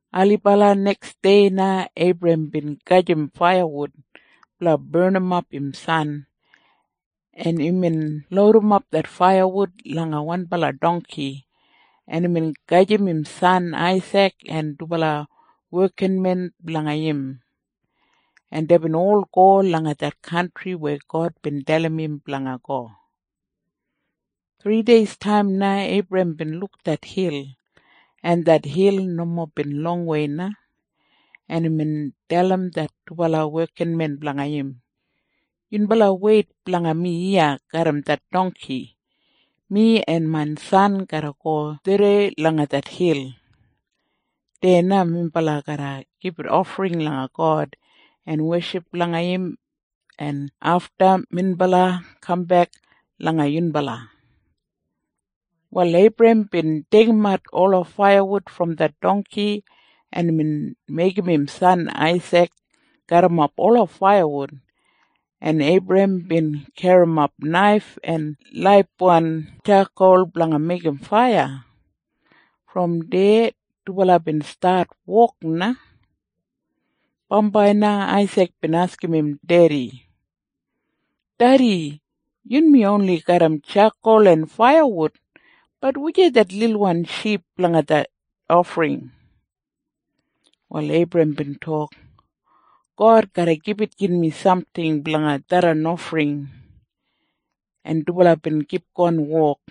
Ailibala neksdei na Eibrahem bin gajim faiyawud blanga barnimap im san, en imbin loudimap det faiyawud langa wanbala dongki, en imbin gajim im san Aisik en dubala wekinmen blanga im, en deibin ol go langa det kantri weya God bin dalim im blanga go. Thrideistaim na Eibrahem bin luk det hil, en det hil nomo bin longwei na, en imbin dalim det dubala wekinmen blanga im, “Yunbala weit blanga mi iya garram det dongki. Mi en main san garra go tharrei langa det hil. Deya na minbala garra gibit ofring langa God en weship langa im, en afta minbala kambek langa yunbala.” Wal Eibrahem bin deigimat ola faiyawud brom det dongki, en imbin meigim im san Aisik garrimap ola faiyawud, en Eibrahem bin garrimap naif en laibwan tjakol blanga meigim faiya. Brom deya dubala bin stat wok na. Bambai na Aisik bin askim im dedi, “Dedi, yunmi oni garram tjakol en faiyawud. Bat wujei det lilwan ship blanga det ofring?” Wal Eibrahem bin tok, “God garra gibit yunmi samting blanga tharran ofring.” En dubala bin kipgon wok.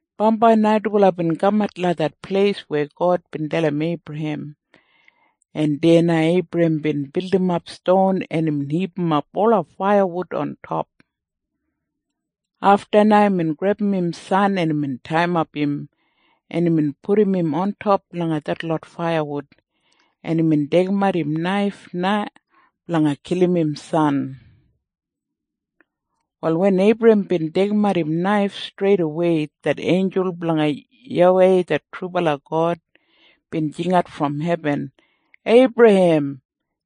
Bambai na dubala bin kamat langa det pleis weya God bin dalim Eibrahem, en deya na Eibrahem bin bildimap ston, en imbin hipimap ola faiyawud ontop. Afta na imbin grebum im san, en imbin taiyimap im, en imbin pudum im ontop langa detlot faiyawud, en imbin deigimat im naif na blanga kilim im san. Wal wen Eibrahem bin deigimat im naif, streidawei det einjul blanga YAWEI det trubala God bin jingat brom hebin, “Eibrahem!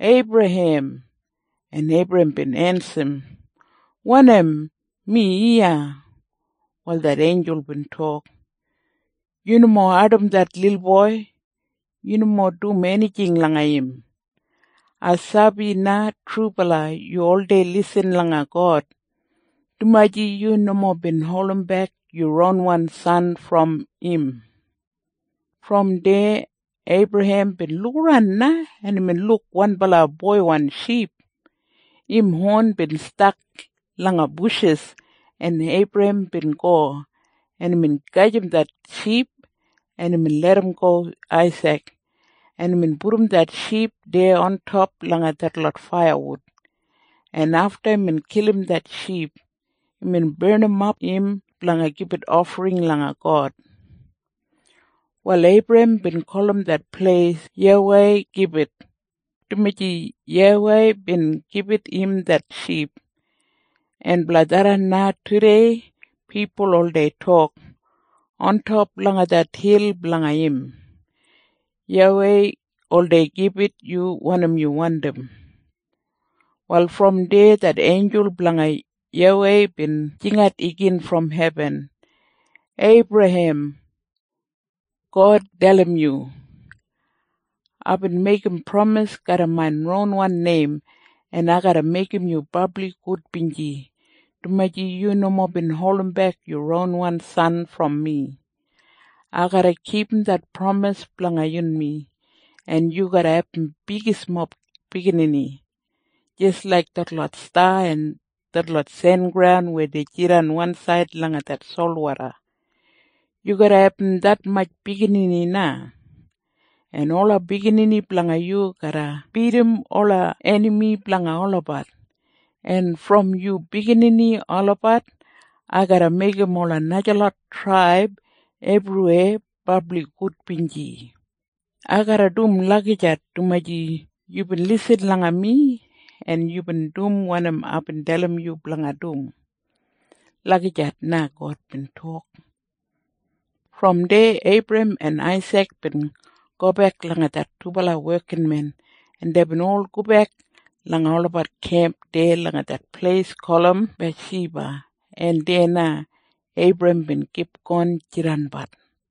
Eibrahem!” En Eibrahem bin ensim, “Wanim? Mi iya.” Wal det einjul bin tok, “Yu nomo ardim det lilboi. Yu nomo dum enijing langa im. Ai sabi na trubala yu oldei lisin langa God, dumaji yu nomo bin holdimbek yu ronwan san brom im.” Brom deya Eibrahem bin lukaran na, en imbin luk wanbala boiwan ship. Im hon bin stak langa bushis, en Eibrahem bin go, en imbin gajim det boiwan ship, en imbin larramgo Aisik, en imbin pudum det ship deya ontop langa detlot faiyawud, en afta imbin kilim det ship, imbin barnimap im blanga gibit ofring langa God. Wal Eibrahem bin gulum det pleis YAWEI Gibit, dumaji YAWEI bin gibit im det ship. En blanga tharran na tudei pipul oldei tok, “Ontop langa det hil blanga im, YAWEI oldei gibit yu wanim yu wandim.” Wal brom deya det einjul blanga YAWEI bin jingat igin brom hebin, “Eibrahem! God dalim yu, ‘Aibin meigim pramis garram main ronwan neim, en ai garra meigim yu brabli gudbinji, dumaji yu nomo bin holdimbek yu ronwan san brom mi. Ai garra kipum det pramis blanga yunmi, en yu garra abum bigismob biginini. Jis laik detlot sta en detlot sengraun weya jidan wansaid langa det solwoda, yu garra abum detmatj biginini na. En ola biginini blanga yu garra bidim ola enami blanga olabat, en brom yu biginini olabat ai garra meigim ola najalot traib ebriweya brabli gudbinji. Ai garra dum lagijat dumaji yubin lisin langa mi en yubin dum wanim aibin dalim yu blanga dum.’ Lagijat na God bin tok.” Brom deya Eibrahem en Aisik bin gobek langa det dubala wekinmen, en deibin ol gobek langa olabat kemp deya langa det pleis gulum Biyashiba, en deya na Eibrahem bin kipgon jidanbat.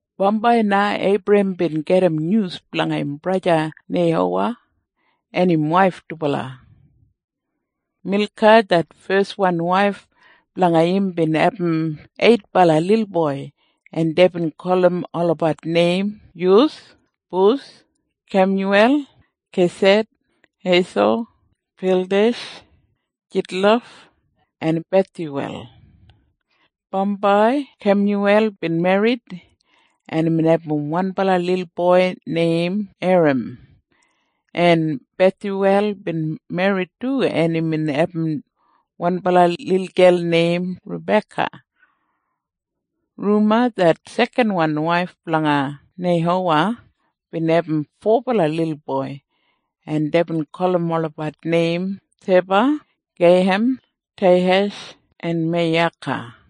Bambai na Eibrahem bin gedim nyus blanga im braja Neihowa en im waif dubala. Milka det feswan waif blanga im bin abum eitbala lilboi, en deibin gulum olabat neim Yus, Bus, Kemyuwel, Kesed, Heiso, Pildesh, Jidlaf en Bethyuwel. Bambai Kemyuwel bin merrit, en imbin abum wanbala lilboi neim Eram, en Bethyuwel bin merrit du, en imbin abum wanbala lilgel neim Rabeka. Ruma det sekanwan waif blanga Neihowa bin abum fobala lilboi, en deibin gulum olabat neim Teba, Geiham, Teihash en Meiyaka.